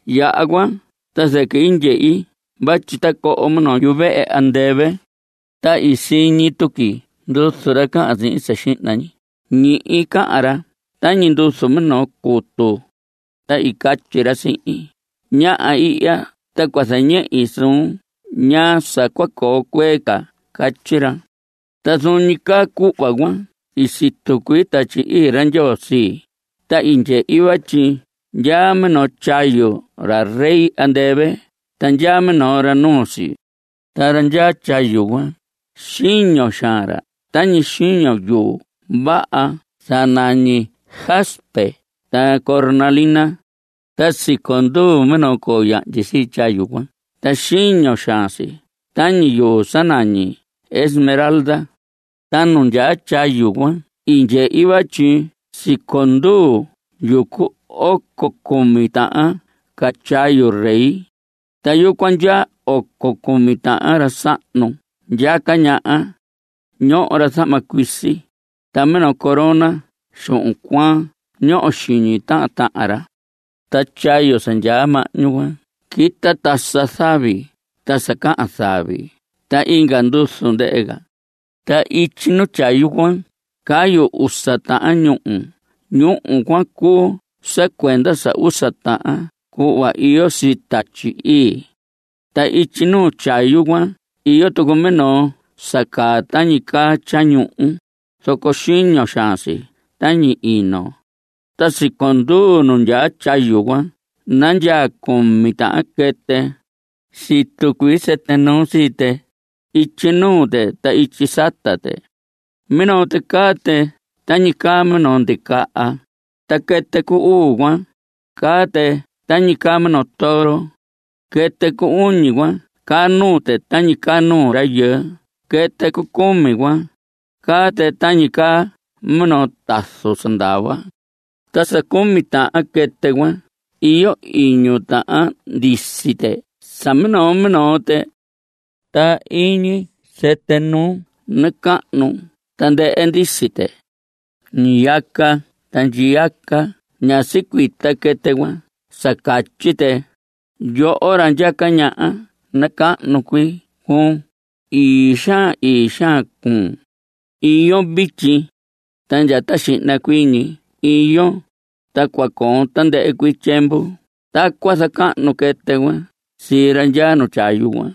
Yaha cuan ta zɨquɨ i ndyehi vatyi tacoho minoo yuvehe andɨvɨ. Ta i siñi tuqui nduzu ra cahan sihin sa xihna ñi. Ñihi cahan ra tañi nduzu minoo cutu. Ta i catyi ra sihin: Ñaha ihya ta cua zañehi suun ñaa sa cua coo cuee ca. Catyi ra. Ta zuun ñi caa cuhva cuan i situ cuii Tatyi Ii ra Ndyoo sii, ta i ndyehi vatyi ndyaa minoo tyayu ra rey andɨvɨ ta ndyaa minoo ra nuu si. Ta ra ndyaa tyayu cuan, xiño xaan ra tañi xiño yuu vaha sa nañi jaspe ta cornalina. Ta siconduu minoo coo yahndyi sii tyayu cuan ta xiño xaan si tañi yuu sa nañi esmeralda. Ta nu ndyaa tyayu cuan i ndyehi vatyi siconduu yucu oco cumi tahan ca tyayu rey. Ta yucuan ndyaa oco cumi tahan ra sahnu ndyaca ñaha. Ñoho ra zahma cuisi, ta minoo corona xuhun cuaan ñoho xiñi tahan tahan ra. Ta tyayu sa ndyaa mahñu cuan quita tasa zavi ta sa cahan zavi ta inga nduzu ndɨhɨ ca. Ta ityi nuu tyayu cuan cayu usa tahan ñúhu. Ñúhu cuan cuu sa cuenda sa usa tahan cuhva iyo sii Tatyi Ii. Ta ityi nuu tyayu cuan iyo tucu minoo sa caa tañi caa tyañuhu, zoco xiño xaan si tañi ino. Ta siconduu nu nandyaa tyayu cuan nandyaa cumi tahan quɨtɨ. Situ cuii sɨtɨ nuu sii tɨ. Ityi nuu tɨ ta ityi sata tɨ. Minoo tɨ caa tɨ tañi caa minoo ndicaha. Ta quɨtɨ cu uu cuan, caa tɨ tañi caa minoo toro. Quɨtɨ cu uñi cuan caa nuu tɨ tañi caa nuu rayɨɨ. Quɨtɨ cu cumi cuan, caa tɨ tañi caa minoo tazu sa ndava. Ta sa cumi tahan quɨtɨ cuan iyo iñu tahan ndisi tɨ sa minoo minoo tɨ. Ta iñi sɨtɨ nuu nacahnu tandɨhɨ ndisi tɨ. Ñiyaca ta ndyiyaca ñá sicuita quɨtɨ cuan sa catyi tɨ: Yoho ra ndyaca ñaha nacahnu cuii cuun. Ii xaan; ii xaan cuun. Iyon vityi, ta ndya ta xihna cuii ñi iyon, ta cua coon tandɨhɨ cuii tyiemvu. Tacuan zacahnu quɨtɨ cuan sii ra ndyaa nu tyayu cuan.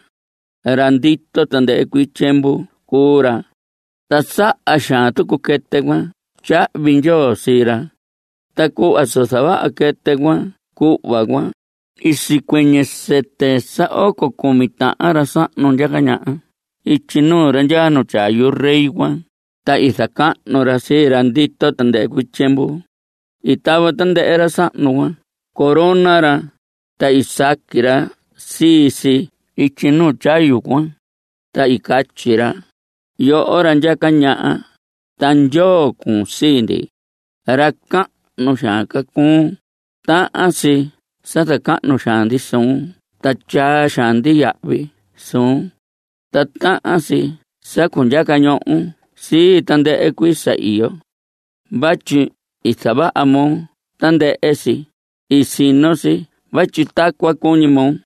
Ra ndito tandɨhɨ cuii tyiemvu cuu ra, ta saha xaan tucu quɨtɨ cuan tyahvi ndyoo sii ra. Ta cuhva sa zavaha quɨtɨ cuan cuhva cuan, i sicuɨñɨ sɨtɨ sa oco cumi tahan ra sahnu ndyaca ñaha ityi nuu ra ndyaa nu tyayu rey cuan, ta i zacahnu ra sii ra ndito tandɨhɨ cuii tyiemvu. I tava tandɨhɨ ra sahnu cuan corona ra, ta i saqui ra sii si ityi nu tyayu cuan, ta i catyi ra: Yoho ra ndyaca ñaha ta Ndyoo cuun sii ndi. Ra cahnu xaan ca cuun. Tahan si sa zacahnu xaan ndi suun ta tyaa xaan ndi yahvi suun. Ta tahan si sa cundyaca ñohon sii tandɨhɨ cuii sa iyo. Vatyi i zavaha moo tandɨhɨ si. I sino si vatyi tacuan cuñi moo.